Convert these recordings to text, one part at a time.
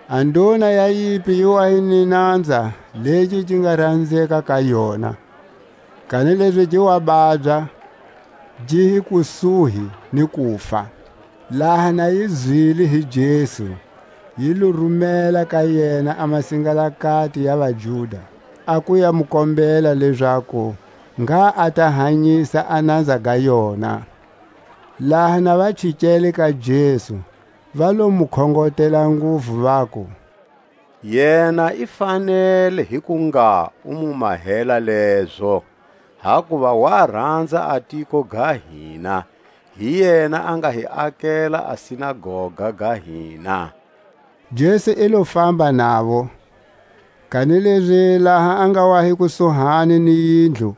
A nduna ya yimpi yi wa hi ni nanza legi gi nga ranzeka ka yona, kanilezi gi wa babya, gi hi kusuhi ni kufa. Laha na yi zwile hi Jesu, yi lo rumela ka yena a masingalakati ya vaJuda, a ku ya mu kombela lezaku ngha a ta hanyisa a nanza ga yona. Laha na va chikele ka Jesu, va lo mu khongotela nguvu, vaku: Yena i fanele hi ku ngha u mu mahela lezo, hakuva wa ranza a tiko ga hina; hi yena a nga hi akela a sinagoga ga hina. Jesu i lo famba navo, kanilezi laha a nga wa hi kusuhani ni yindlu,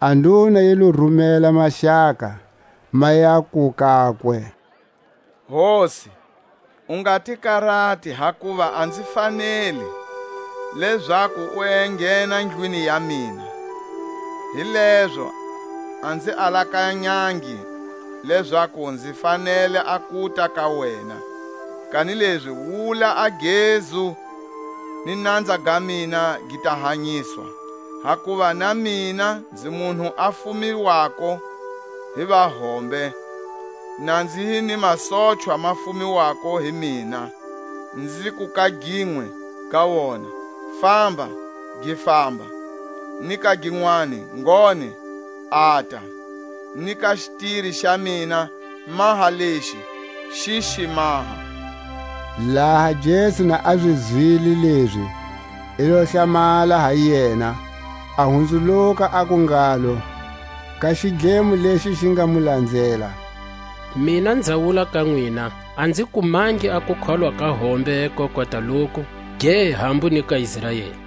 a nduna yi lo rumela maxaka, ma yaku kakwe: Hosi, u nga ti karati; hakuva a nzi faneli lezaku u enghena ndlwini ya mina. Hilezo a nzi alakanyangi lezaku nzi fanele a kuta ka wena; kanilezi wula a gezu, ni nanza ga mina gi ta hanyiswa. Hakuva na mina nzi munhu a fumiwako hi vahombe, na nzi hi ni masochwa ma fumelwako hi mina. Nziku ka ginwe ga wona: Famba, gi famba; ni ka ginwani: Ngone, ata; ni ka xitiri xa mina: Maha lexi, xi xi maha. Laha Jesu na zi zwile lezi, i lo hlamala ha yena, a hunzuluka, aku ngalo ka xidlemo lexi xi nga mu lanzela: Mina nza wula ka nwina, A nzi kumangi a kukholwa ka hombe ko kota loku, ge hambu ni ka Israeli.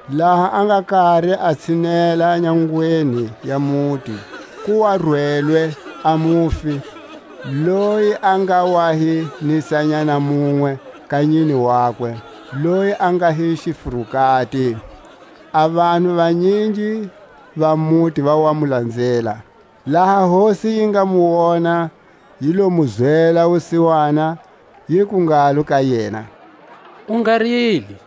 Laha a nga kari a tshinela nyangweni ya muti, ku wa rwelwe a mufi, loyi a nga wa hi nisanyana munwe ka nyine wakwe, loyi a nga hi xifurukati; a vanhu vanyingi va muti va wa mu lanzela. Laha Hosi yi nga mu wona, yi lo mu zwela wusiwana, yiku ngalo ka yena: U nga rili!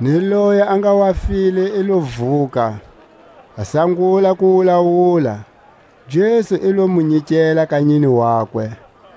Ni loyi a nga wa file i lo vuka, a sangula ku wulawula. Jesu i lo mu nyikela ka nyine wakwe.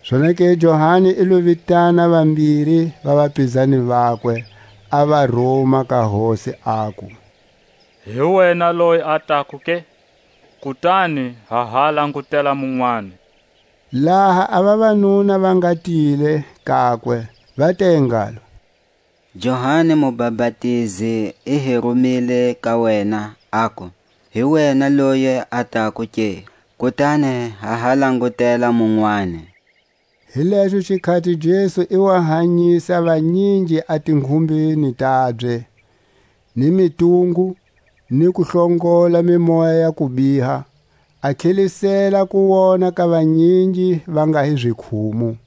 Zonake Johani i lo vitana vambiri va vapizani vakwe, a va ruma ka Hosi, aku: Hi wena loyi a tako ke, kutani ha ha langutela munwani? Laha a vavanuna va nga tile kakwe, va te ngalo: Johani Mubapatizi i hi rumile ka wena, aku; Hi wena loyi a tako ke, kutani ha ha langutela munwani? Hi lexo xikhati Jesu i wa hanyisa vanyingi a tinghumbeni tabye, ni mitungu, ni ku hlongola mimoya ya kubiha, a tlhelisela kuwona ka vanyingi va nga hi zikhumu.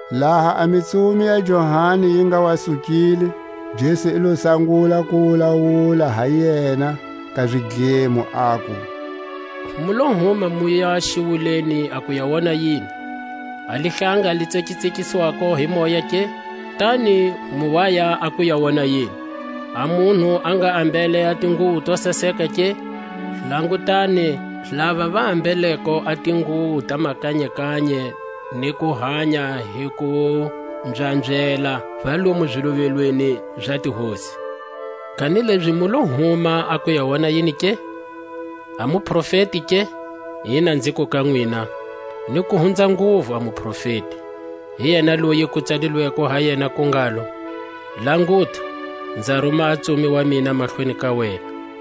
Laha a mitsumi ya Johani yi nga wa sukile, Jesu i lo sangula ku wulawula ha yena ka zidlemo, aku: Mu lo huma muya xiwuleni a ku ya wona yini? A lihlanga li tsekatsekiswako hi moya ke? Kutani mu waya a ku ya wona yini? A munhu a nga ambele a tinguwo to saseka ke? Langutani, lava va ambeleko a tinguwo ta makanye-kanye, ni ku hanya hi ku mbyambyela, va lomu ziluvelweni za tihosi. Kanilezi mu lo huma a ku ya wona yini ke? A muprofeti ke? Ina, nziku ka nwina, ni ku hunza nguvu a muprofeti. Hi yena loyi ku tsalilweko ha yena ku ngalo: Languta, nza ruma a ntsumi wa mina mahlweni ka wena,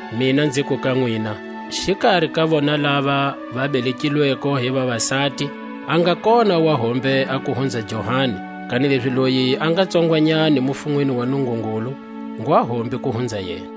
Mina nziku ka nwina: Xikari ka vona lava va belekilweko hi vavasati a nga kona wa hombe a ku hunza Johani; kanilezi loyi a nga tsongwanyani mufunweni wa Nungungulu ngwa hombe ku hunza yena.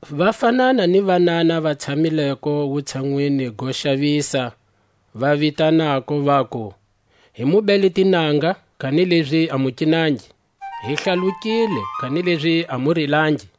Va fanana ni vanana va tshamileko wutshanwini go xavisa, va vitananako, vaku: Hi mu bele tinanga, kanilezi a mu kinangi; Hi hlalukile, kanilezi a mu rilangi.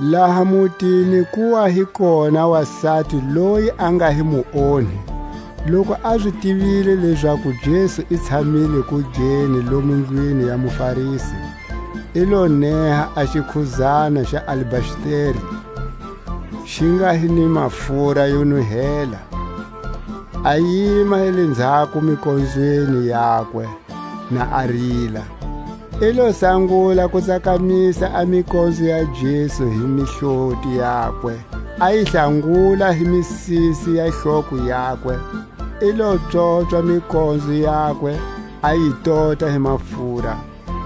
Laha mutini ku wa hi kona a wasati loyi a nga hi muonhi; loku a zi tivile lezaku Jesu i tshamile kugeni lomu ndlwini ya muFarisi, i lo neha a xikhudzana xa alabasteri xi nga hi ni mafura yo nuhela, a yima hi lenzhako mikonzweni yakwe, na a rila; i lo sangula ku tsakamisa a mikonzo ya Jesu hi mihloti yakwe, a yi hlanguta hi misisi ya hloko yakwe; i lo pswopswa mikonzo yakwe, a yi tota hi mafura.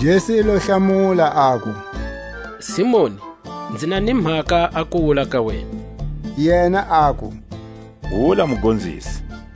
Jesu i lo mu hlamula, aku: Simoni, Nzi na ni mhaka a ku wula ka wena. Yena aku: Wula Mugonzisi.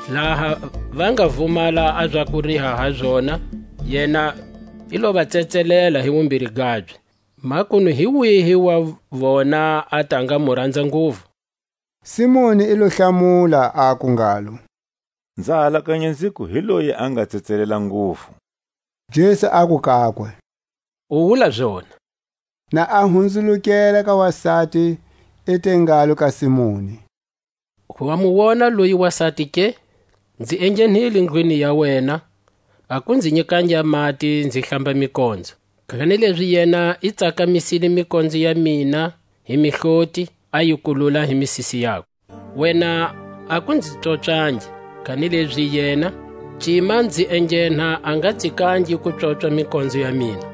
Laha va nga vumala a za ku riha ha zona, yena i lo va tsetselela hi wumbiri gabye. Makunu hi wihi wa vona a ta nga mu ranza nguvu. Simoni i lo hlamula, aku ngalo: Nza alakanya nziku hi loyi a nga tsetselelwa nguvu. Jesu aku kakwe: U wula zona. Na a hunzulukela ka wasati, i te ngalo ka Simoni: Wa mu wona loyi wasati ke? Nzi enghenile ndlwini ya wena, a ku nzi nyikangi a mati nzi hlamba mikonzo; kanilezi yena i tsakamisile mikonzo ya mina hi mihloti, a yi kulula hi misisi yakwe. Wena a ku nzi pswopswangi, kanilezi yena, cima nzi enghena a nga tsikangi ku pswopswa mikonzo ya mina.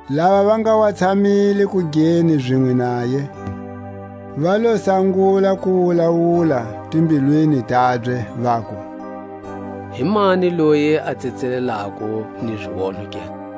Lava va nga wa tshamile kugeni zinwe naye, va lo sangula ku wulawula timbilwini tabye, vaku: Himani loyi a tsetselelako ni zionho ke?